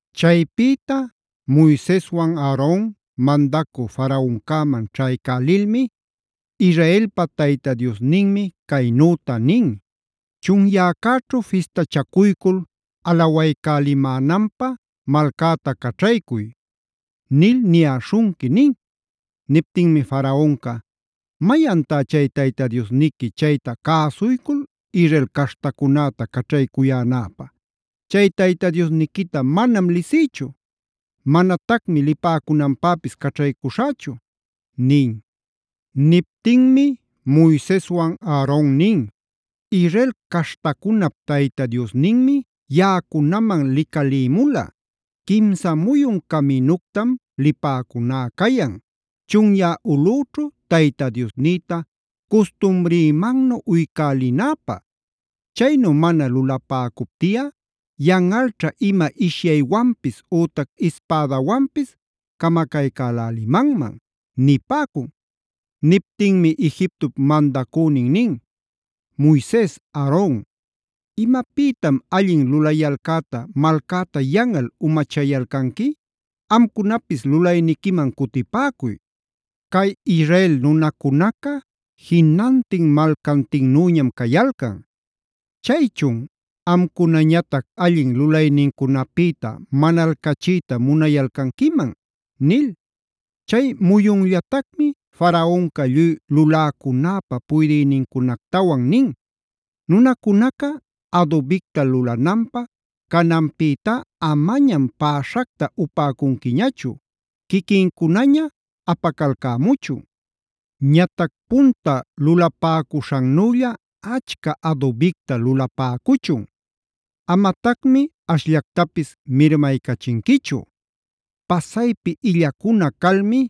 Chaypïta Moiseswan Aaron mandacü Faraoncäman ćhaycälilmi: “Israelpa Tayta Diosninmi caynüta nin: ‘Chunyäcäćhu fistachacuycul alawaycälimänanpä malcäta caćhaycuy’ nil niyäśhunqui” nin. Niptinmi Faraonca: “¿Mayantá chay Tayta Diosniqui chayta cäsuycul Israel caśhtacunäta caćhaycuyänäpä? Chay Tayta Diosniquita manam lisïchu; manatacmi lipäcunanpäpis caćhaycushächu” nin. Niptinmi Moiseswan Aaron nin: “Israel caśhtacunap Tayta Diosninmi yaꞌacunaman licalïmula. Quimsa muyun caminuctam lipäcuná cayan, chunyä ulꞌüćhu Tayta Diosnïta custumrïmannu uycälinäpä. Chaynu mana lulapäcuptiꞌa yanꞌalćha ima ishyaywanpis ütac ispädawanpis camacaycälälimanman” nipäcun. Niptinmi Egiptop mandacünin nin: “Moises, Aaron ¿imapïtam allin lulayalcäta malcäta yanꞌal umachayalcanqui? Amcunapis lulanayquiman cutipäcuy. Cay Israel nunacunaca jinantin malcantinnüñam cayalcan. Chaychun ¿amcunañatac allin lulaynincunapïta manalcachiyta munayalcanquiman?” nil. Chay muyunllatacmi Faraonca lluy luläcunäpä puydïnincunactawan nin: “Nunacunaca adubicta lulananpä cananpïtá amañam päśhacta upäcunquiñachu; quiquincunaña apacalcämuchun. Ñatac punta lulapäcuśhannülla achca adubicta lulapäcuchun. Amatacmi ashllactapis mirmaycachinquichu. Pasaypi illacuna calmi: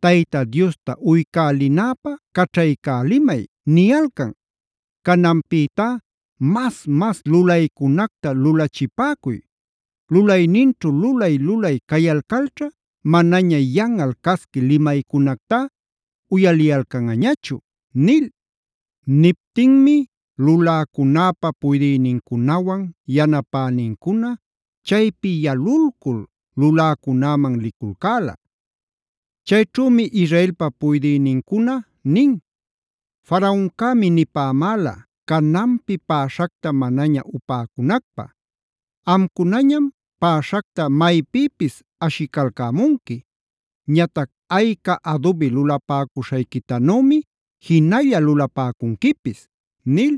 ‘Tayta Diosta uycälinäpä caćhaycälimay’ niyalcan. Cananpïtá mas-mas lulaycunacta lulachipäcuy. Lulayninćhu lulay-lulay cayalcalćha manaña yanꞌal casqui limaycunactá uyaliyalcanꞌañachu” nil. Niptinmi luläcunäpa puydïnincunawan yanapänincuna chaypi yalulcul luläcunäman liculcäla. Chayćhümi Israelpa puydïnincuna nin: “Faraoncämi nipämäla cananpi päśhacta manaña upäcunacpä. Amcunañam päśhacta maypïpis ashicalcämunqui. Ñatac ayca adubi lulapäcuśhayquitanümi jinalla lulapäcunquipis” nil.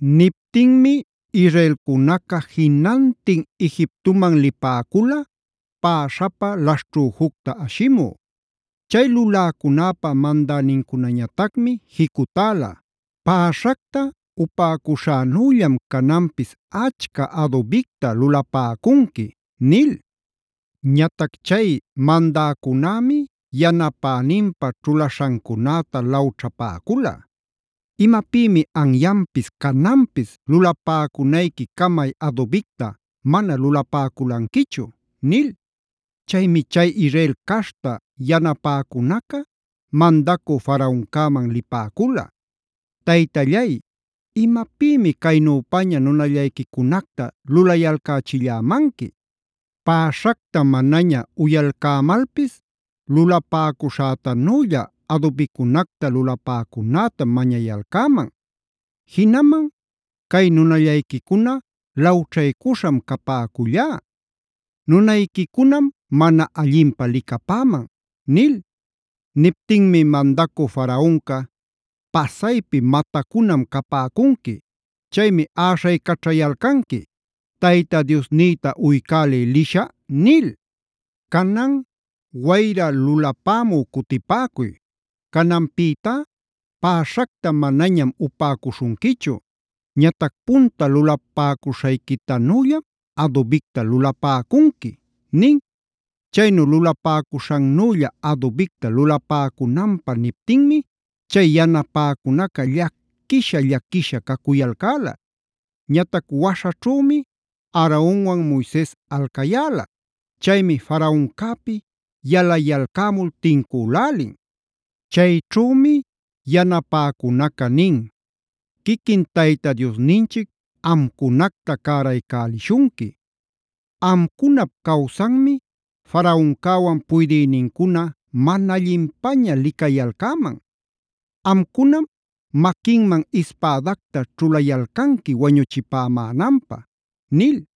Niptinmi Israelcunaca jinantin Egiptoman lipäcula päśhapä laśhćhüjucta ashimü. Chay luläcunäpä mandänincunañatacmi jicutäla: “Päśhacta upäcuśhänüllam cananpis achca adubicta lulapäcunqui” nil. Ñatac chay mandäcunämi yanapäninpä ćhulaśhancunäta lawćhapäcula: “¿Imapïmi anyanpis cananpis lulapäcunayqui camay adubicta mana lulapäculanquichu?” nil. Chaymi chay Israel caśhta yanapäcunaca mandacü Faraoncäman lipäcula: “Taytallay, ¿imapïmi caynüpaña nunallayquicunacta lulayalcächillämanqui? Päśhacta manaña uyalcämalpis lulapäcuśhätanülla adubicunacta lulapäcunätam mañayalcäman. Jinaman cay nunallayquicuna lawćhaycuśham capäcullá. Nunayquicunam mana allinpä licapäman” nil. Niptinmi mandacü Faraonca: “¡Pasaypi matacunam capäcunqui! Chaymi äśhaycaćhayalcanqui: Tayta Diosnïta uycälï lishä’ nil. ¡Canan wayra lulapämü cutipäcuy! Cananpïtá päśhacta manañam upäcuśhunquichu. Ñatac punta lulapäcuśhayquitanüllam adubicta lulapäcunqui” nin. Chaynu lulapäcuśhannülla adubicta lulapäcunanpä niptinmi chay yanapäcunaca llaquisha-llaquisha cacuyalcäla. Ñatac waśhaćhümi Aaronwan Moises alcayäla. Chaymi Faraoncäpi yalayalcämul tincülälin. Chayćhümi yanapäcunaca nin: “¡Quiquin Tayta Diosninchic amcunacta cäraycälishunqui! Amcunap-cawsanmi Faraoncäwan puydïnincuna mana allinpaña licayalcäman. Amcunam maquinman ispädacta ćhulayalcanqui wañuchipämänanpä” nil.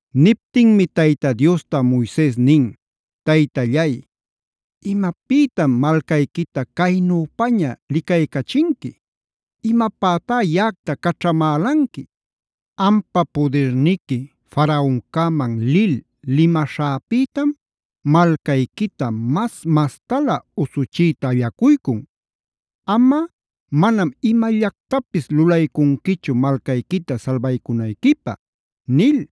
Niptinmi Tayta Diosta Moises nin: Taytallay, ¿imapïtam malcayquita caynüpaña licaycachinqui? ¿Imapätá yaꞌacta caćhamälanqui? Ampa pudirniqui Faraoncäman lil limaśhäpïtam malcayquita mas-mastalä usuchiyta allacuycun. Amꞌa manam imallactapis lulaycunquichu malcayquita salbaycunayquipä” nil.